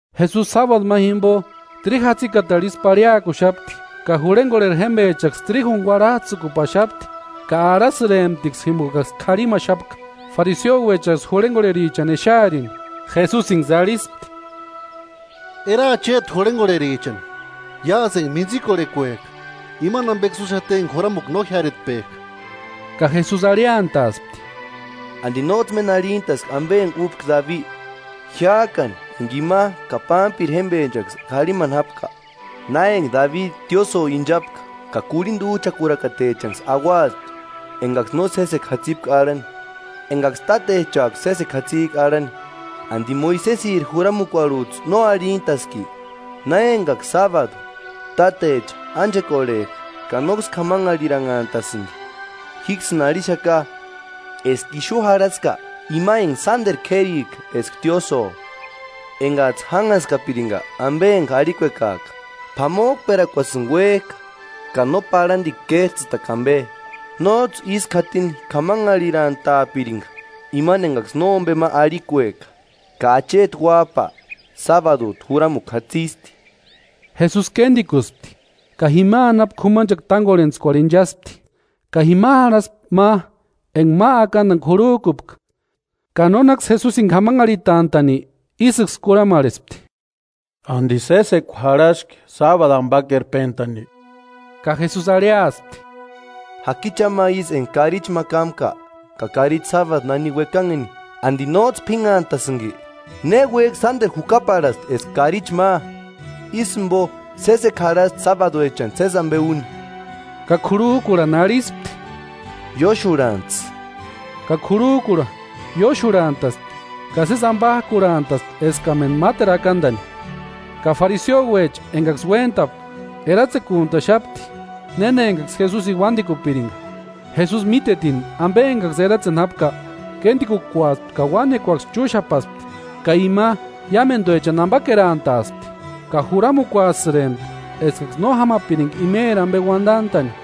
Jesusi sábadu ma jimpo, tríju jatsikatarhu isï parhiakuxapti, ka jurhenkorheri jémpechaksï tríjuni kuarhats'ïkupaxapti ka arhasïremptiksï jimpokaksï karhimaxapka. Fariseuechaksï jurhenkorherichani exearini, Jesusinksï arhispti: “Eraa chéti jurhenkorherichani, iásï enka mintsikorhekuek'a, imani ampeksï úxati enka juramukua no jiáretpek'a.” Ka Jesusi arhiantaaspti: “¿Anti nóts'ï méni arhintaski ampe enka úpka Dabi, jiák'ani enka ima ka pámpiri jémpechaksï k'arhimani jápka? Na enka Dabi tiósïo inchapka ka kurhinta úch'akurakatechanksï auaspti enkaksï no sésekua jatsipka arhani, enkaksï tátechak'u sésekua jatsik'a arhani. ¿Anti Moisesiri juramukuarhuts'ï no arhintaski? Na enkaksï sábadu, tátecha ánchekorhek'a ka nóksï k'amanharhiranhantasïnti. Jíksïni arhixaka, eska ixu jarhaska ima enka sánteru k'érika eska tiósïo. Enkats'ï jánhaskapirinka ampe enka arhikuekak'a: ‘P'amok'perakuasïni uék'a ka no parhantikua kéts'ïtakua ampe’, nóts'ï ísku jatini k'amanharhirantaapirinka imani enkaksï nómpe ma arhikueka. Ka Acheti Uáp'a, sábadut'u juramukua jatsisti.” Jesusi kéntikusti ka jima anapu k'umanchekua tánkorhentskuarhu inchaspti. Ka jima jarhaspti ma enka ma akantani k'urhuk'upka, ka nónaksï Jesusini k'amanharhitant'a'ni ísïksï kurhamarhespti: “¿Anti sésekua jarhaski sábadu ampakerpentani?” Ka Jesusi arhiaspti: “Jaki cha ma ísï enka karichini ma kámka, ka karichi sábadu nani uekanheni, ¿Anti nóts'ï p'ínhantasïnki? ¡Néuek'i sánteru jukaparhasti eska karichi ma! Ísï jimpo sésekua jarhasti sábaduechani sési ampe úni.” Ka k'urhuk'urhani arhispti: “Ióxurhantsï.” Ka k'urhuk'urha ióxurhant'aspti, ka sési ampak'urhantaspti eskamentu máteru akantani. Ka fariseuecha enkaksï uéntapka, eratsekuntaxapti néna enkaksï Jesusini uántikupirinka. Jesusi mítetini ampe enkaksï eratseni jápka, kéntikukuaspti, ka uánekuaksï chúxapaspti ka ima iámentuechani ampakerantaaspti, ka juramukuasïrempti eskaksï no jámapirinka imeri ampe uantant'a'ni;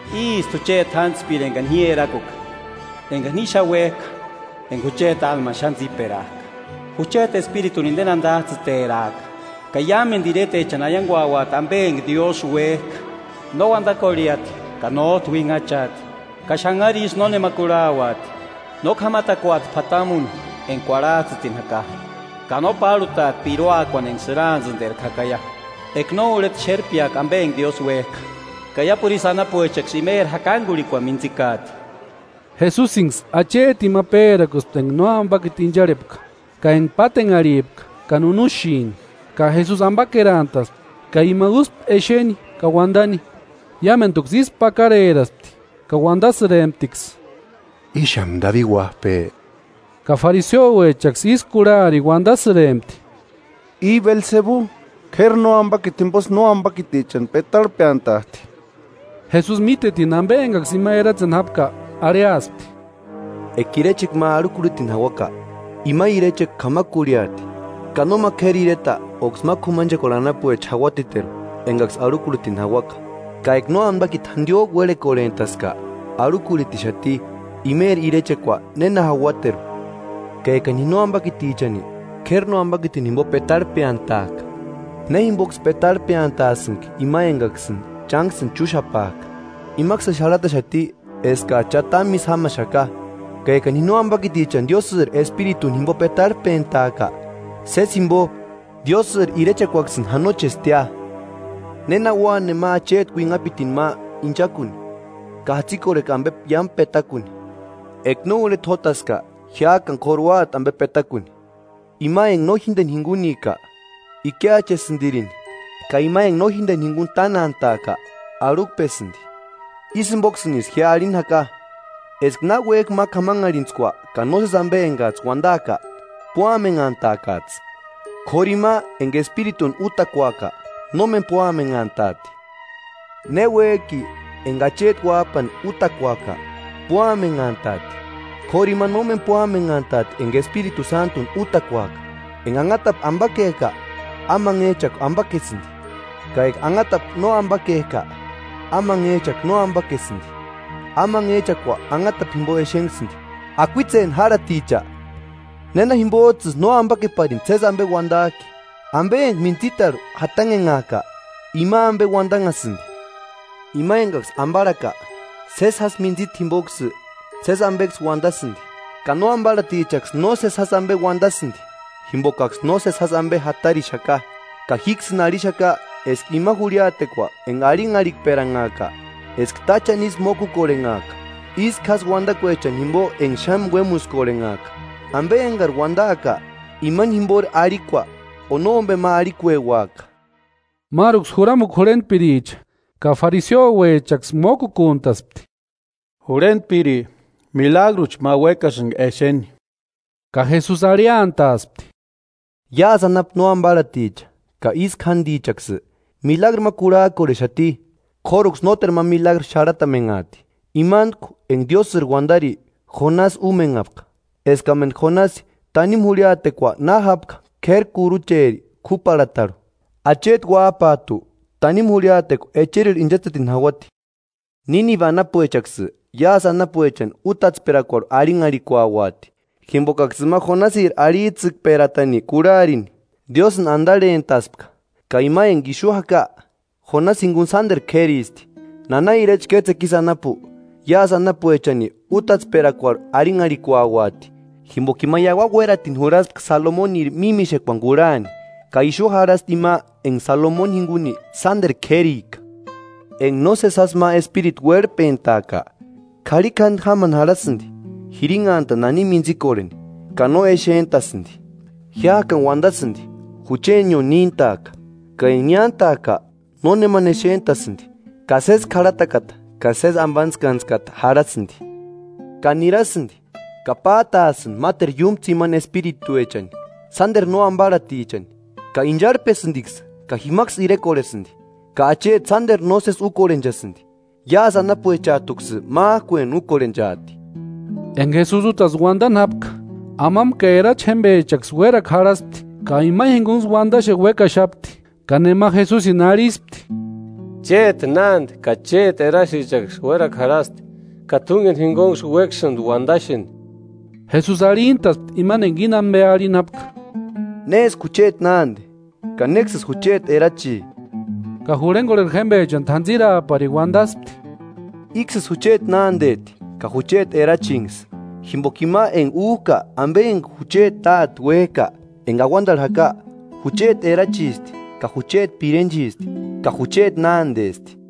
“Ísti jucheti jántspiri enkani ji erakuka, enkani ji xáni uék'a, enka jucheti álmani xáni tsíperak'a. Jucheti Espirituni inteni antats'ïteraaka ka iámentu iretechani aiankuantauati ampe enka Diósï uék'a. No uantakorheati ka nót'u uinhachaati, ka xanharu isï nónema kurhauati. No k'amatakuati p'atamuni enka kuarhats'ïtini jaka, ka no párhutaati piruakuani enka sïraantsïnterku jakaia, eka no urheta xérpeaka ampe enka Diósï uék'a. Ka iápuru isï anapuechaksï imeri jakankurhikuani mintsikaati.” Jesusinksï achetini ma pérakuspti enka nóampakiti incharhepka, ka enka pátenharhipka ka nunuxini, ka Jesusi ampakerantaspti ka ima úspti exeni ka uantani. Iámentuksï ísku pakareraspti ka uantasïremptiksï: “¿Íxamu Dabidi Uáp'e?” Ka fariseuechaksï ísï kurharini uantasïrempti: “I Belsebu, k'éri nóampaki jimposï nóampakitichani petarhpeantat'i.” Jesusi mítetini ampe enkaksï ima eratseni jápka, arhiaspti: “Eka irechekua ma arhukurhitini jauaka, ima irechekua k'amakurhiati, ka nóma k'éri ireta óksï ma k'umanchekuarhu anapuecha jauatiteru enkaksï arhukurhitini jauaka. Ka eka nóampakiti jantiok'u uérhekorhent'aska, arhukurhitixati; ¿Imeri irechekua néna jauateru? Ka ekani ji nóampakitichani, k'éri nóampakitini jimpo petarhep'eantak'a, ¿Ne jimpoksï petarhpeantasïnki ima enkaksïni chánksïni chúxapak'a? Imaksïni xarhataxati eskats'ï cha támu ísï jámaxaka. Ka ekani ji nóampakitichani Diósïri Espirituni jimpo petarhpentak'a, sési jimpo, Diósïri irechekuaksïni janochestia. ¿Néna ua nema acheti uinhapitini ma inchakuni, ka jatsikorhekua ampe iámu petakuni? Eka no urheta jótaska, jiák'ani k'óru úati ampe petakuni. Ima enka no jínteni jinkunika, ikiachesïntirini, ka ima enka no jínteni jinkuni tánantak'a, arhukpesïnti.” “Ísï jimpoksïnisï ji arhini jaka, eska náki uék'i ma k'amanharhintskua ka nósesi ampe enkats'ï uantaaka, púamenhantaakats'ï. K'óru ima enka Espirituni útakuaka, nómeni púamenhantaati. Ne uék'i enka Acheti uáp'ani útakuaka, púamenhantaati, k'óru ima nómeni púamenhantaati enka Espiritu Sántuni útakuaaka.” “Enka anhatapu ampakek'a, amanhech'akua ampakesïnti, ka enka anhatapu no ampakek'a, amanhech'akua no ampakesïnti; amanhech'akua anhatapu jimpo exenhasïnti. ¡Akuitseni járhaticha! ¿Néna jimpots'ïsï no ampakeparini sési ampe uantak'i? Ampe enka mintsitarhu jatanhenhak'a ima ampe uantanhasïnti. Ima enkaksï amparhaka, sési jásï mintsita jimpoksï, sési ampeksï uantasïnti, ka nóamparhatichaksï nósesi jásï ampe uantasïnti, jimpokaksï nósesi jásï ampe jatarixaka. Ka jíksïni arhixaka eska ima jurhiatekua enka arhinharhikperanhaaka, eska táchani ísï mókukorhenhaaka ísku jásï uantakuechani jimpo enka xáni uémuskorhenhaka. Ampe enkari uantaaka, imani jimpori arhikua o nómpe ma arhikueuaka.” Máruksï juramukua jurhentpiricha ka fariseuechaksï mókukuntaspti: “Jurhentpiri, milagruchi ma uékasïnka exeni.” Ka Jesusi arhiantaaspti: “Iásï anapu no amparhaticha ka ísku jántichaksï milagru ma kurhak'orhexati, k'óruksï nóteru ma milagru xarhatamenhaati, imantku enka Diósïri uantari Jonasi úmenhaka. Eskamentu Jonasi tanimu jurhiatekua na jápka k'éri kurucheri k'úparhatarhu, Acheti uáp'at'u tanimu jurhiatekua echerirhu inchatsetini jauati. Nínibe anapuechaksï iásï anapuechani útatsperakuarhu arhinharhikuauati, jimpokaksï ima Jonasiri arhits'ïkperatani kurharini, Diósïni antarhent'aska, ka ima enka ixu jaka, Jonasi jinkuni sánteru k'éristi. Nana irecha kétsekua ísï anapu, iásï anapuechani útatsperakuarhu arhinharhikuauati, jimpoka ima iauani uératini jurhaspka Salomoniri mímixekuani kurhani, ka ixu jarhasti ima enka Salomoni jinkuni sánteru k'érika.” “Enka nósesi jásï ma espiritu uérhpentak'a, k'arhikjantu jámani jarhasïnti jirinhantani nani mintsikorheni, ka no exent'asïnti. Jiák'ani uantasïnti: ‘Juchenio níntaaka.’ Ka enka niántak'a, nónemani exent'asïnti ka sési k'arhatakata ka sésesi ampantskantskata jarhasïnti. Ka nirasïnti ka pát'aasïnti máteru iúmu tsimani espirituechani, sánteru nóamparhatichani, ka incharhpesïntiksï ka jimaksï irekorhesïnti, ka acheti sánteru nósesi úkorhenchasïnti. Iásï anapuechat'uksï mák'ueni úkorhenchaati.” Enka Jesusi útasï uantani jápka, amampa ka erachi jémpechaksï uérakua jarhaspti, ka ima jinkunksï uantaxeni uékaxapti. Ka nema Jesusini arhispti: “Chéti nánte ka chéti erachichaksï uérakua jarhasti, ka t'únkeni jinkunksï uékasïnti uadaxeni.” Jesusi arhintaspti imani enka íni ampe arhini jápka: “¿Néski jucheti nánte ka néksïsï jucheti erachi?” Ka jurhenkorheri jémpechani t'antsiraaparini uantaspti: “Íksïsï jucheti nánteti ka jucheti erachinksï, jimpoka ima enka úk'a ampe enka jucheti Táte uék'a enka auantarhu jaka, jucheti erachisti ka jucheti pirenchisti ka jucheti nántesti.”